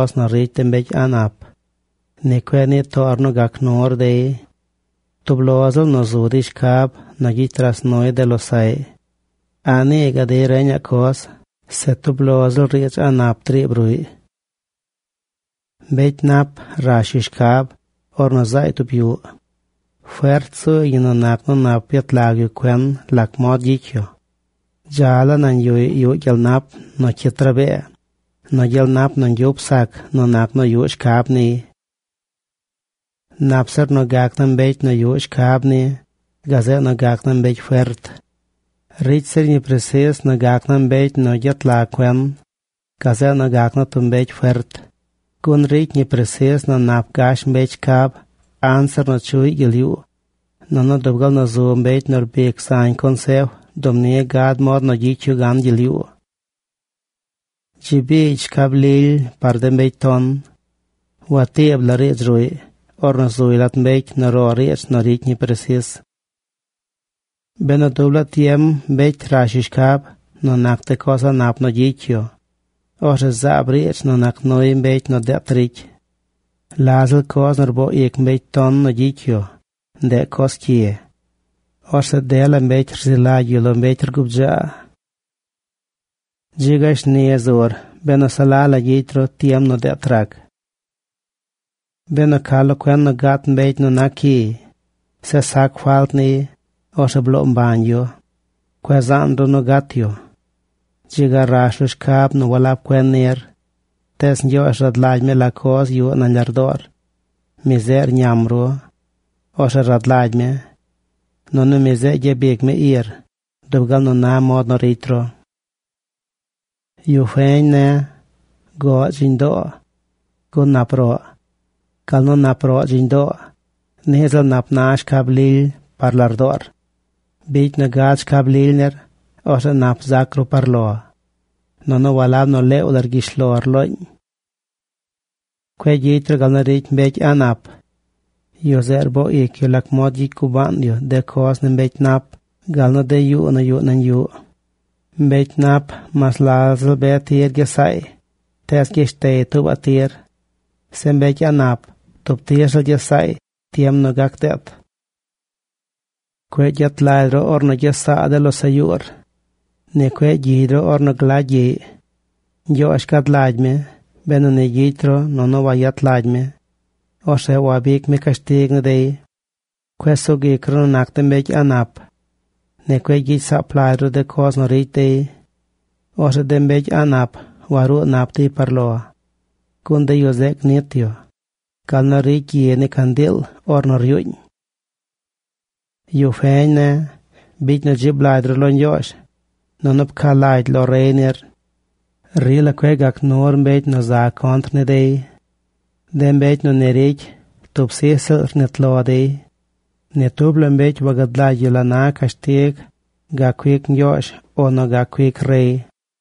nu ricy de mbecy a̱ꞌ nap. Ni cueꞌ nii toor nu gac nur dey. Tub lo ziꞌl nu zu dey shcab nu gyicy ras nuy de losaꞌy. A̱ꞌ nii gaꞌ dey reñaꞌ coz, se tub lo ziꞌl riidz a̱ꞌ nap driib ruꞌy. Mbecy nap rash yu shcab ornu zaay tub yuꞌ. Fert zuuy ñi nu nac nu nap yet lag yu cuen lac mod gyicy yu. Dza laa nañ yuꞌy yuꞌ gyel nap nu cyit rabee nu gyel nap nu ñgyup sac nu nac nu yuꞌ shcab niy. Nap zir nu gac naa mbecy nu yuꞌ shcab ni gazeꞌ nu gac naa mbecy fert. Ricy zir ñi presis nu gac naa mbecy nu gyet lag cuen gazeꞌ nu gac naa tub mbecy fert. Gun ricy ñi presis nu nap gash mbecy shcab anzir nu chuꞌy gyel yuu. Nunu dub gal nu zu mbecy nu rbic zañ consef, dub ni gad mod nu gyicy yu gan gyel yuu. Dzi biigy shcab lily par de mbecy ton. Watiib la riidz ruꞌy ornu zuy lat mbecy nu ro riidz nu ricy ñi presis. Benu dub laa tiem mbecy rash yu shcab nu nac de coz a̱ꞌ nap nu gyicy yu, orzeꞌ zaab riidz nu nac nuy mbecy nu deet ricy. La ziꞌl coz nu rboo ic mbecy ton nu gyicy yu, ndeꞌ coz cyi. Orzeꞌ dela mbecy rzi lagy yu lo mbecy rguu bdzaa. Dzi ga shni zur benu se la la gyicy ru tiem nu deet rac. Benu ca lo cuen nu gat mbecy nu nac cyiy, zeꞌ sac falt niy, orzeꞌ bloo mbañ yu. Cueꞌ zaan ru nu gat yu. Dzi ga rash ru shcab nu walab cuen nir. Tees Ñgyoozh rad lagy mi la coz yuꞌ nañ lardoor. Mi zeꞌ rñam ru. Orzeꞌ rad lagy mi. Nunu mi zeꞌ gyabic mi ir dub gal na mod nu ricy ru. Yu feñ ne̱, goꞌ dziñ doo. Gun nap roꞌ. Gal nu nap roꞌ dziñ doo, niꞌ ziꞌl nap na shcab lily par lardoor. Bicy nu gad shcab lily nir. Orzeꞌ nap zac ru par lo. Nunu walab nu leew la rgyish lor loñ. Cueꞌ gyicy ru gal nu ricy mbecy a̱ꞌ nap. Yu zeꞌ rboo ic yu lac mod gyicy gubaan yu de coz ni mbecy nap gal nu de yuu nu yuꞌ nañ yuꞌ. Mbecy nap, mas la ziꞌl be tir gyes saay, tees gyeshtey tuubaꞌ tir. Zeꞌ mbecy a̱ꞌ nap, tub tir ziꞌl gyes saay tiem nuꞌ gac deet. Cueꞌ gyet lagy ru ornu gyes saa de losaꞌ yuur. Ni cueꞌ gyigy ru ornu glagy gyiꞌy. Ñgyoozh gad lagy mi benu ni gyicy ru nunu wayet lagy mi. Orzeꞌ wabic mi cashtig ni dey. Cueꞌ sug ic ru nu nac de mbecy a̱ꞌ nap. Ni cueꞌ gyicy saap lagy ru de coz nu ricy dey. Orzeꞌ de mbecy a̱ꞌ nap waruu nap dey par lo. Gun de yu zeꞌ gnit yu gal nu ricy gyi ni candiil ornu ryuuñ. Yu feñ ne̱, bicy nu dzib lagy ru lo Ñgyoozh, nunu pca lagy lo rey nir. Rila cueꞌ gac nur mbecy nu za contr ni dey. De mbecy nu ni ricy, tub sij ziꞌl rnit lo dey. Ni tub la mbecy wagad lagy yu la na cashtig gac cuic Ñgyoozh o nu gac cuic rey.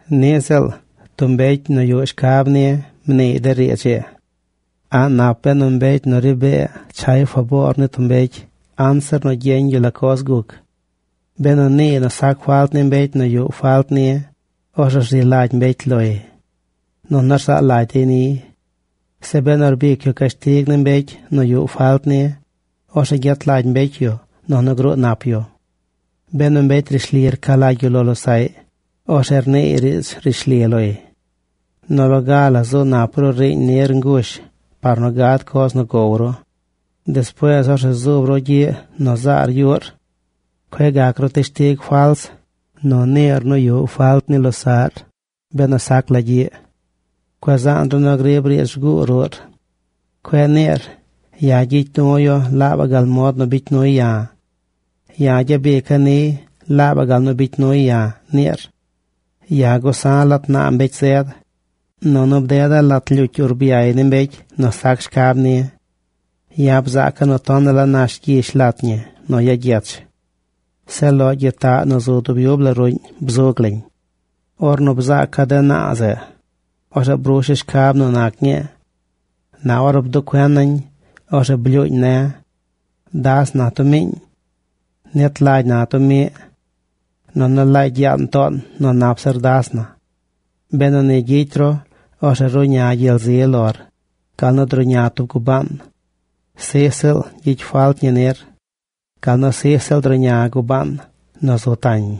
Niꞌ ziꞌl tub mbecy nu yuꞌ shcab ni mniiy de riidz ii. A̱ꞌ nap benu mbecy nu ri bee chay faboor ni tub mbecy anzir nu gyeñ yu la coz guc. Benu niiy nu sac falt ni mbecy nu yuꞌ falt ni, orzeꞌ rzi lagy mbecy loy, nunu rzaa lagy dey niy. Se benu rbic yu cashtig ni mbecy nu yuꞌ falt ni, orzeꞌ gyet lagy mbecy yu nunu gruu nap yu. Benu mbecy rishli rca lagy yu lo losaꞌy, orzeꞌ rniiy riidz rishli loy. Nu loga la zu nap ru riiñ nir ngush par nu gad coz nu gow ru. Despuees orzeꞌ zuub ru gyiꞌ nu zaar yuꞌr. Cueꞌ gac ru teshtig fals nu niir nu yuꞌ falt ni losaꞌr benu sac la gyiꞌ. Cueꞌ zaan ru nu griib riidz rguu ruꞌr. Cueꞌ niir: “Ya̱ gyicy du̱ yu laabaꞌ gal mod nu bicy nuy ya̱. Ya̱ gyabica̱ niy laabaꞌ gal nu bicy nuy ya̱”, niir. Ya̱ gusa̱ lat naa mbecy zed. Nunu bdeda̱ lat lyucy urbyay ni mbecy nu sac shcab ni. Ya̱ bzaaca̱ nu tonaꞌ la nash gyish lat ñi nu ya gyech. Zeꞌ loꞌ gyitaꞌ nu zu dub yub la ruꞌñ bzug lañ. Ornu bzaaca̱ de naa zeꞌ, orzeꞌ brusha̱ shcab nu nac ñii. Na ornu bduꞌ cuena̱ñ, orzeꞌ blyuuñ ne̱: “Das na tub miiñ. Nit lagy na tub miꞌ. Nunu laagy yaan toon nu nap zir das na.” Benu ni gyicy ru, orzeꞌ ruꞌña gyel zi lor gal nu druꞌña tub gubaan. Sij ziꞌl gyicy falt ñi nir gal nu sij ziꞌl druꞌña gubaan nu zu tañ.